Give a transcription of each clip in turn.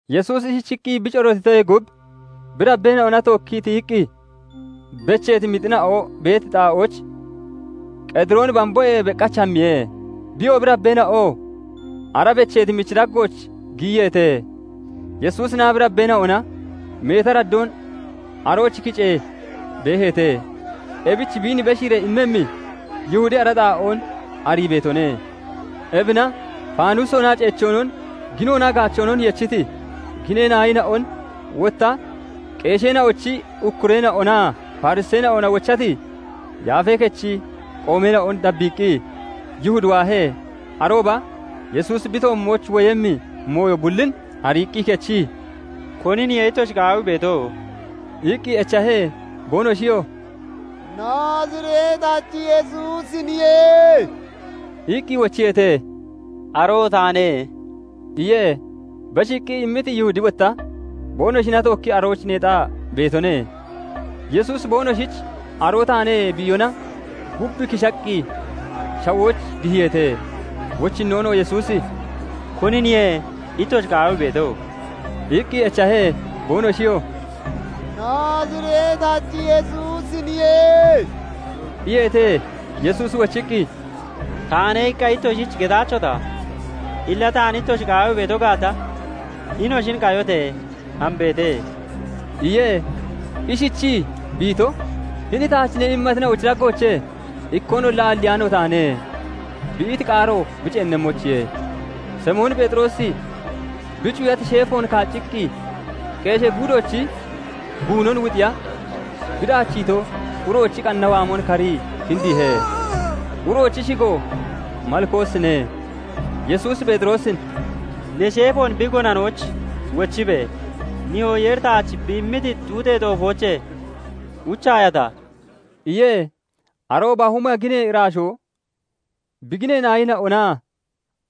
Yesuusi ishichiqqi bi corootitoyee gub, bi dabbeena'ona tookkii tiyiqqi becheeti mixina'o beeti xaa'ooch, Qedirooni bamboyee beqach hammiye; biyo, bi dabbeena'oo ara becheeti michi daggooch giyiyeete. Yesuusinaa bi dabbeena'ona meeti araddoon arooch kicee beeheete; ebich biin beshiiree immemmi Yihudi ara xaa'oon arii beetone. Ebina faanusoonaa ceechoonon, ginoonaa gaachoonon yechiti ginee naayina'on, wotta qeesheena'ochi ukkureena'onaa Fariseena'ona wochati Yaafee Kechi qoomeena'on dabbiiqqi Yihudi waahe. Arooba Yesuusi bi toommooch woyemmi mooyo bullin ariiqqi kechii, "Koniniye ittoshi qaawii beeto?" iqqi echahe. Boonoshiyoo "Naazireetachi Yesuusiniye" iqqi wochiyeete. "Aroo taane" iye. Beshiiqqi immiti Yihudi wotta boonoshina tookkii arooch neexaa beetone. Yesuusi boonoshich "Aroo taane" bi iyona, gub kishaqqi shawooch dihiyeete. Wochinnoon Yesuusi "Koniniye ittoshi qaawii beeto?" iqqi echahe. Boonoshiyoo "Naazireetachi Yesuusiniye" iyeete. Yesuusi wochiqqi, " 'Taane' iqqa ittoshich getaachota? Illa taan ittoshi qaawii beeto gaata, hinoshin qayote! Hambeete" iye. Ishichii bi ito, "Hini taach ne immatina'ochi daggoochee ikkoonolla aalliyaano taane" bi iti qaaro bi ceennemmoyichiye. Simoon Pheexiroosi bi cuyati sheefoon kaacciqqi qeeshee guudoochi guunon wuxiya bi daachiito uroochi qanna waamon karii kindiihe; uroochi shigoo Malkoosine. Yesuusi Pheexiroosin "Ne sheefoon bi gonanooch wochibe! Nihoo Yeeri taach bi immiti xuuxee xoofoochee uchaayata?" iye. Arooba huma ginee iraashoo bi ginee naayina'onaa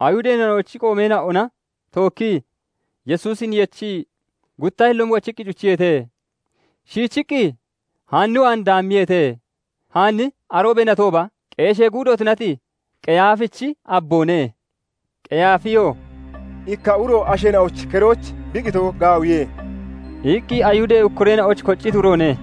Ayihudeena'ochi qoomeena'ona tookkii Yesuusin yechii gutta hilloon wochiqqi cuchiyeete; shiichiqqi Haan waan daammiyeete; Haanni aroobee natooba qeeshee guudo tunati Qeyaafichi abboone. Qeyaafiyoo "Ikka uro asheena'ochi keroyich bi qitoo gaawiye" iqqi Ayihudee ukkureena'oyich kocciti uroone.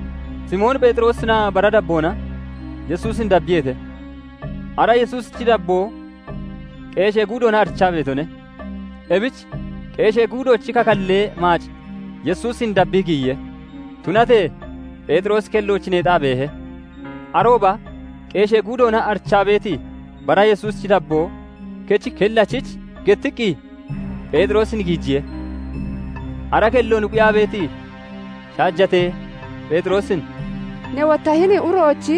Simoon Pheexiroosinaa bara dabboona Yesuusin dabbiyeete. Ara Yesuusichi dabboo qeeshee guudoona arichaa beetone; ebich qeeshee guudoochi kakallee maac Yesuusin dabbii giyiye; Tunatee Pheexiroosi kellooch neexaa beehe. Arooba qeeshee guudoona arichaa beeti bara Yesuusichi dabboo kechi kellachich gettiqqi Pheexiroosin giijiye. Ara kelloon quyaa beeti shaajate Pheexiroosin "Ne wotta hini uroochi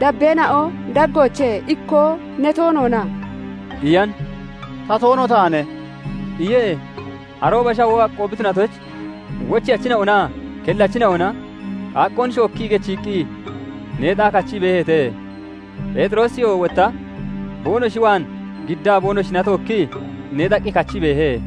dabbeena'o daggoochee ikkoo ne toona?" iyan. "Ta toono taane" iye. Arooba shawoo aqqoo bi tunatoyich wocheyachina'onaa kellachina'ona qaaqqoon shookkii gechiiqqi neexaa kachii beeheete; Pheexiroosiyoo wotta boonoshi waan giddaa boonoshina tookkii neexaqqi kachii beehe.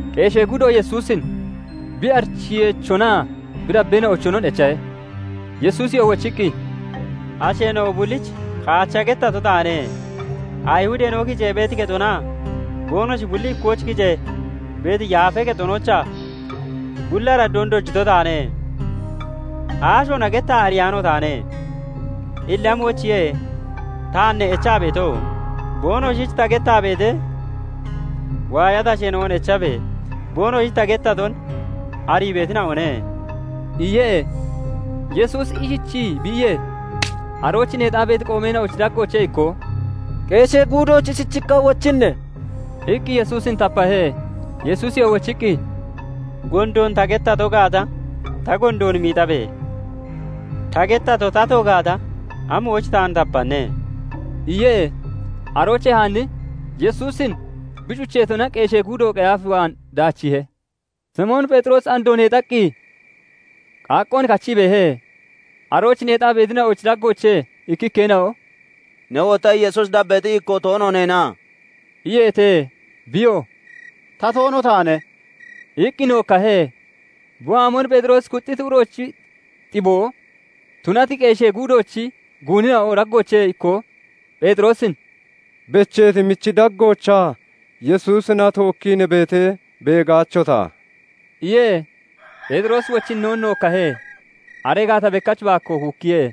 Qeeshee guudo Yesuusin bi arichiyeechonaa bi dabbeena'ochonon echahe. Yesuusiyoo wochiqqi, "Asheena'o bullich kaacha gettato taane; Ayihudeena'o kicee beeti kexonaa boonoshi bulli ikkooch kicee beeti Yaafee Kexonoochaa bulli araddoon dojito taane; aashoona gettaa ariyaano taane. Illa amoyichiye taan ne echaa beeto? Boonoshich ta gettaa beetee waayati asheena'on echabe! Boonoshich ta gettaton arii beetina'one" iye. Yesuusi ishichii bi iyee, arooch neexaa beeti qoomeena'ochi daggoochee ikkoo "Qeeshee guudoyich ishichiqqa wochinne?" iqqi Yesuusin tapahe. Yesuusiyoo wochiqqi, "Gondoon ta gettato gaata, ta gondoon miixabe! Ta gettato tato gaata, amoyich taan tapanne?" iye. Aroochee Haanni Yesuusin bi cucheetona qeeshee guudo Qeyaaf waan daachiihe. Simoon Pheexiroosi andoo neexaqqi qaaqqoon kachii beehe. Arooch neexaa beetina'ochi daggoochee ikkikkeena'o "Ne wotta Yesuusi dabbeexi ikkoo toono neena?" iyeete. Biyoo "Ta toono taane" iqqi nookkahe. Bi waamon Pheexiroosi kuxxiti uroochi xiboo tunati qeeshee guudoochi guunina'o daggoochee ikkoo Pheexiroosin "Becheeti michi daggoochaa Yesuusina tookkii ne beetee beegaachota?" iye. Pheexiroosi wochinnoon nookkahe; aree gaata bekkach baakkoo kuukkiye.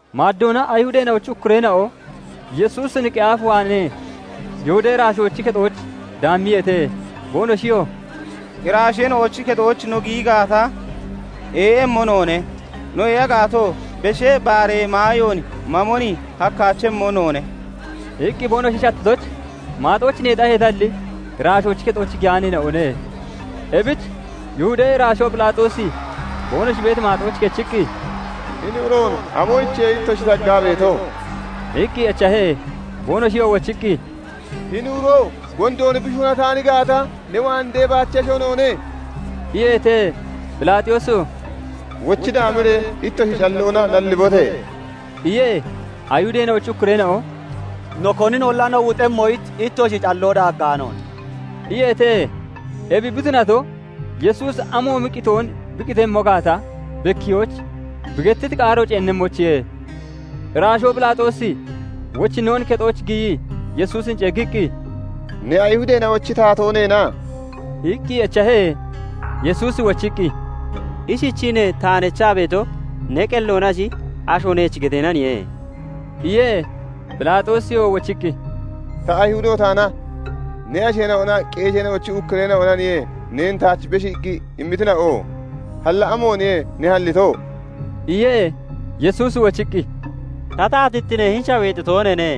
Maaddoona Ayihudeena'ochi ukkureena'o Yesuusin Qeyaaf waanee Yihudee iraashoochi kexooch daammiyeete; boonoshiyoo "Iraashoochi kexooch no giyi gaata, ee'emmo noone; no ee'a gaatoo Beshee Baaree maayoon mamon hakkaachemmo noone" iqqi boonoshi shattitoyich, maaxooch neexaheetalli, iraashoochi kexooch giyaaneena'one. Ebich Yihudee iraashoo Phelaaxoosi boonoshi beeti maaxooch kechiqqi, "Hini uroon amoyichiye ittoshi taggaa beeto?" iqqi echahe. Boonoshiyoo wochiqqi, "Hini uro gondoon bi shuunataan gaata, ne waan deebaachesho noone" iyeete. Phelaaxoosiyoo "Wochi daamiree ittoshi calloona nallibote!" iye. Ayihudeena'ochi ukkureena'o "No koninolla no wuxemmoyich, ittoshi calloo daaggaanoone" iyeete. Ebi bi tunato, Yesuusi amoomi qitoon bi qitemmo gaata bekkiyoyich bi gettiti qaaro ceennemmoyichiye. Iraashoo Phelaaxoosi wochinnoon kexooch giyii Yesuusin ceeggiqqi, "Ne Ayihudeena'ochi taatoo neena?" iqqi echahe. Yesuusi wochiqqi, "Ishichii ne taan echaa beeto, ne qelloonashi, asho neech geteenaniye?" iye Phelaaxoosiyoo wochiqqi, "Ta Ayihudo taanna? Ne asheena'onaa qeesheena'ochi ukkureena'onaniye neen taach beshiiqqi immitina'o. Halla amooniye ne hallito?" iye. Yesuusi wochiqqi, "Ta taatittine hini shaweexi tooneene.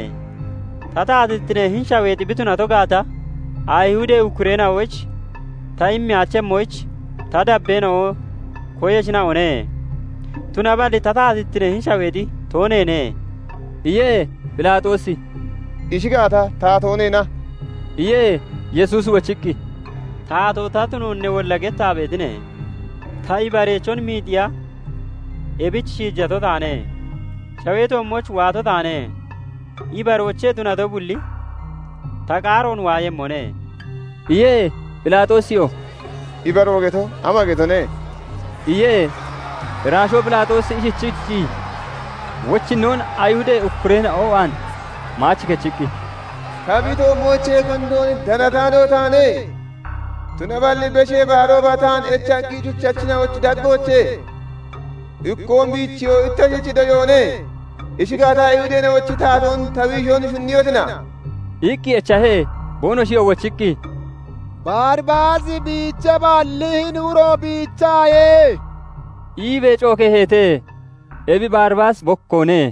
Ta taatittine hini shaweexi bi tunato gaata, Ayihudee ukkureena'oyich ta immeyaachemmoyich ta dabbeena'o koyeshina'one; tunaballi ta taatittine hini shaweexi tooneene" iye. Phelaaxoosi "Ishi gaata, taatoo neena?" iye. Yesuusi wochiqqi, "Taatoo ta tunoon newolla gettaa beetine. Ta, ibareechon miixiya ebich shiijato taane; shawee toommooch waato taane. Ibaroochee tunato bulli ta qaaroon waayemmone" iye. Phelaaxoosiyoo "Ibaroo geto ama getone?" iye. Iraashoo Phelaaxoosi ishichiichii, wochinnoon Ayihudee ukkureena'o waan maach kechiqqi, "Ta bi toommoochee gondoon danataano taane. Tunaballi Beshee Baarooba taan echaqqi cuchatina'ochi daggoochee ikkoon biichiyoo ittoshich doyoone. Ishi gaata, Ayihudeena'ochi taatoon ta biishon shunniyotina?" iqqi echahe. Boonoshiyoo wochiqqi, "Baribaasi biicheeballi, hini uro biicheyaaye" iibee cookeeheete; ebi Baribaasi bokkoone.